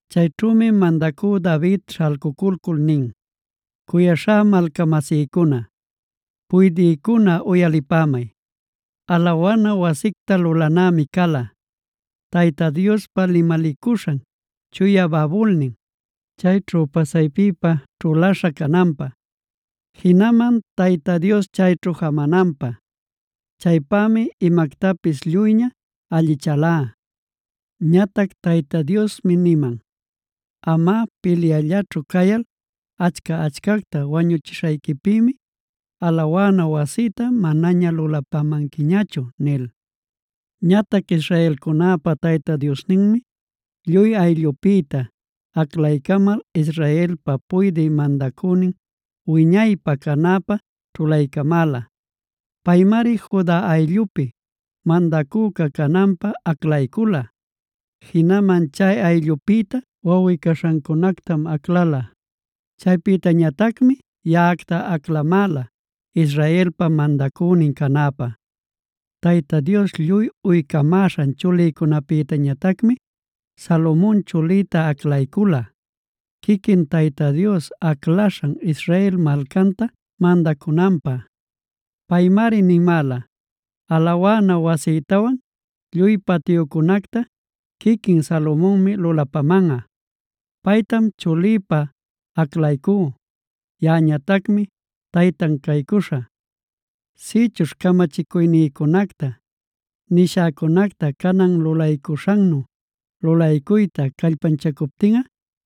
Chayćhümi mandacü David śhalcuculcul nin: “Cuyaśhá malcamasïcuna, puydïcuna uyalipämay. Alawana wasicta lulanämi cala, Tayta Diospa limalicuśhan chuya babulnin, chayćhu pasaypipä ćhulaśha cananpä, jinaman Tayta Dios chayćhu jamananpä. Chaypämi imactapis lluyña allichälá. Ñatac Tayta Diosmi niman: ‘Amꞌa pilyullaćhu cayal achca-achcacta wañuchishayquipïmi alawana wasïta manaña lulapamanquiñachu’ nil. “Ñatac israelcunäpa Tayta Diosninmi lluy ayllüpïta aclalcamal Israelpa puydï mandacünin wiñaypä canäpä ćhulaycamäla. Paymari Juda ayllupi mandacüca cananpä aclaycula. Jinaman chay ayllupïta wawꞌi-caśhäcunactam aclala; chaypïñatacmi yaꞌacta aclamäla, Israelpa mandacünin canäpä. Tayta Dios lluy uycamäśhan chulïcunapïñatacmi Salomon chulïta aclaycula, quiquin Tayta Dios aclaśhan Israel malcanta mandacunanpä. Paymari nimäla: ‘Alawana wasïtawan lluy patyuncunacta chuliqui Salomonmi lulapamanꞌa. Paytam chulïpa aclaycú; yaꞌañatacmi taytan caycuśhä. Sïchuśh camachicuynïcunacta, nishäcunacta canan lulaycuśhannu lulaycuyta callpanchacuptinꞌa,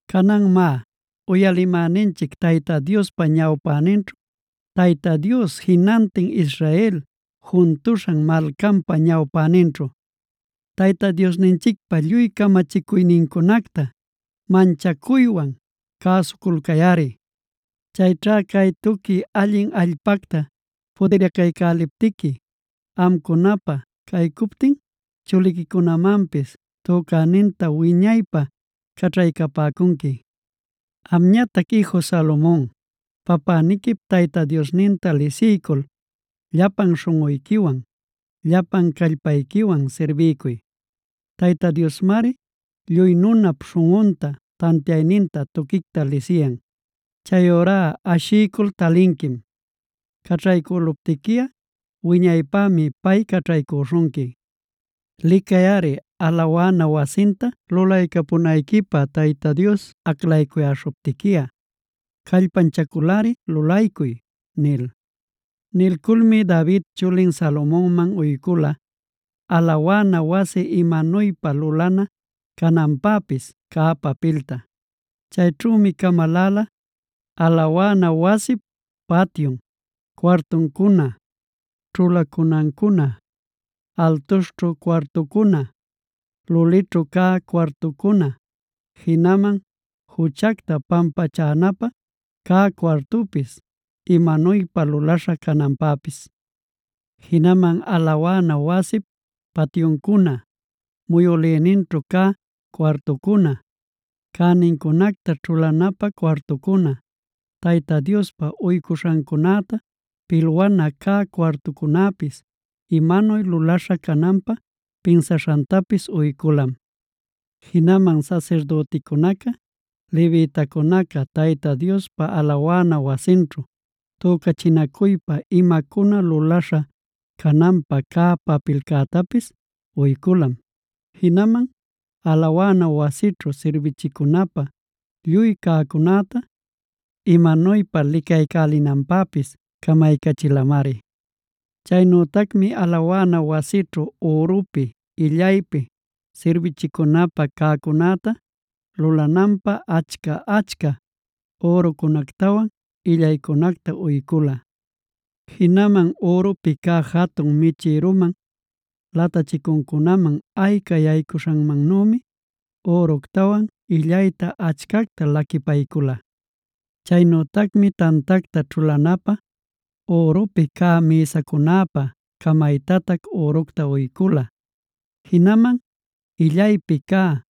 “Canan má, uyalimäninchic Tayta Diospa ñawpäninćhu, Tayta Dios jinantin Israel juntuśhan malcanpa ñawpäninćhu, Tayta Diosninchicpä lluy camachicuynincunacta manchacuywan cäsuculcayꞌari. Chayćha cay tuqui allin allpacta pudiracaycäliptiqui, amcunapä caycuptin chuliquicunamanpis tücäninta wiñaypä caćhaycapäcunqui. “Amñatac iju Salomon, papäniquip Tayta Diosninta lisiycul, llapan śhunꞌuyquiwan, llapan callpayquiwan sirbiycuy. Tayta Diosmari lluy nunap śhunꞌunta, tantiayninta tuquicta lisiyan. Chayurá ashiycul talinquim; caćhaycüluptiquiꞌa wiñaypämi pay caćhaycüśhunqui. Licayꞌari, alawana wasinta lulaycapunayquipä Tayta Dios aclaycuyäśhuptiquiꞌa, callpanchaculꞌari lulaycuy” nil. Nilculmi David chulin Salomonman uycula, alawana wasi imanuypa lulana cananpäpis cä papilta. Chayćhümi camaläla: alawana wasip patyun, cuartuncuna, ćhulacunancuna, altuśhćhu cuartucuna, lulićhu cä cuartucuna, jinaman juchacta pampachanapä cä cuartupis imanuypa lulaśha cananpäpis. Jinaman alawana wasip patyuncuna, muyülïninćhu cä cuartucuna, cänincunacta ćhulanapä cuartucuna, Tayta Diospä uycuśhancunäta pilwana cä cuartucunapis imanuy lulaśha cananpä pinsaśhantapis uyculam. Jinaman sasirdüticunaca, levitacunaca Tayta Diospa alawana wasinćhu tücachinacuypa imacuna lulaśha cananpä cä papilcätapis uyculam. Jinaman alawana wasićhu sirbichicunapä lluy cäcunäta imanuypa licaycälinanpäpis camaycachilamari. Chaynütacmi alawana wasićhu ürupi, illaypi sirbichicunapä cäcunäta lulananpä, achca-achca ürucunactawan illaycunacta uycula. Jinaman ürupi cä jatun michïruman latachicuncunaman ayca yaycuśhanmannümi, üructawan illayta achcacta laquipaycula. Chaynütacmi tantacta ćhulanapä ürupi cä mïsacunapä camaytatac üructa uycula. Jinaman illaypi cä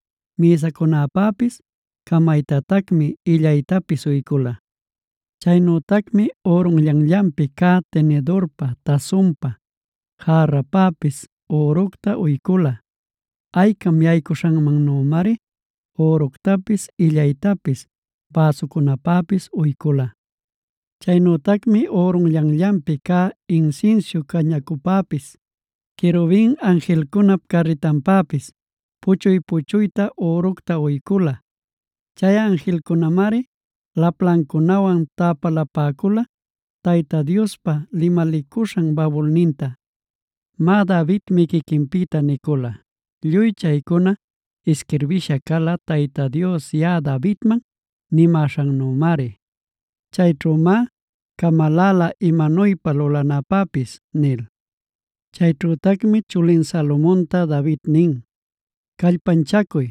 mïsacunapäpis camaytatacmi illaytapis uycula. Chaynütacmi ürunllanllanpi cä tinidurpä, tasunpä, järrapäpis üructa uycula. Aycam yaycuśhanmannümari üructapis illaytapis bäsucunäpäpis uycula. Chaynütacmi ürunllanllanpi cä insinsiu cañacupäpis, querubin anjilcunap carritanpäpis, puchuy-puchuyta üructa uycula. Chay anjilcunämari laplancunawan täpalapäcula Tayta Diospa limalicuśhan babulninta. Má, Davidmi quiquinpïta nicula: “Lluy chaycuna isquirbisha cala Tayta Dios yaꞌa Davidman nishanmannümari. Chayćhümá camaläla imanuypä lulananpäpis” nil. Chayćhütacmi chulin Salomonta David nin: “Callpanchacuy,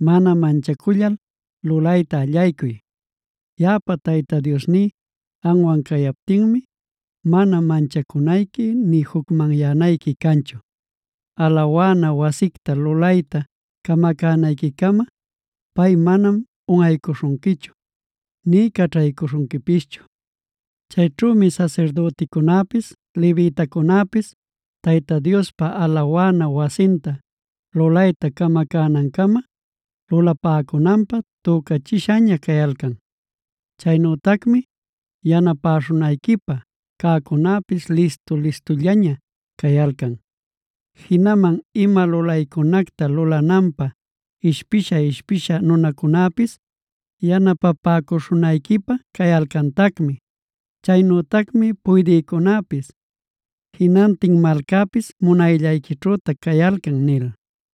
mana manchacullal lulayta allaycuy. Yaꞌapa Tayta Diosní amwan cayaptinmi, mana manchacunayqui nï jucmanyanayqui canchu. Alawana wasicta lulayta camacänayquicama pay manam unꞌaycuśhunquichu nï caćhaycuśhunquipischu. Cayćhümi sasirdüticunapis, levitacunäpis Tayta Diospa alawana wasinta lulayta camacänancama, lulapäcunanpä tücächishaña cayalcan. Chaynütacmi yanapäśhunayquipä cäcunäpis listu-listullaña cayalcan. Jinaman ima lulaycunacta lulananpä ishpisha-ishpisha nunacunäpis yanapapäcuśhunayquipä cayalcantacmi. Chaynütacmi puydïcunäpis jinantin malcapis munayllayquićhütac cayalcan” nil.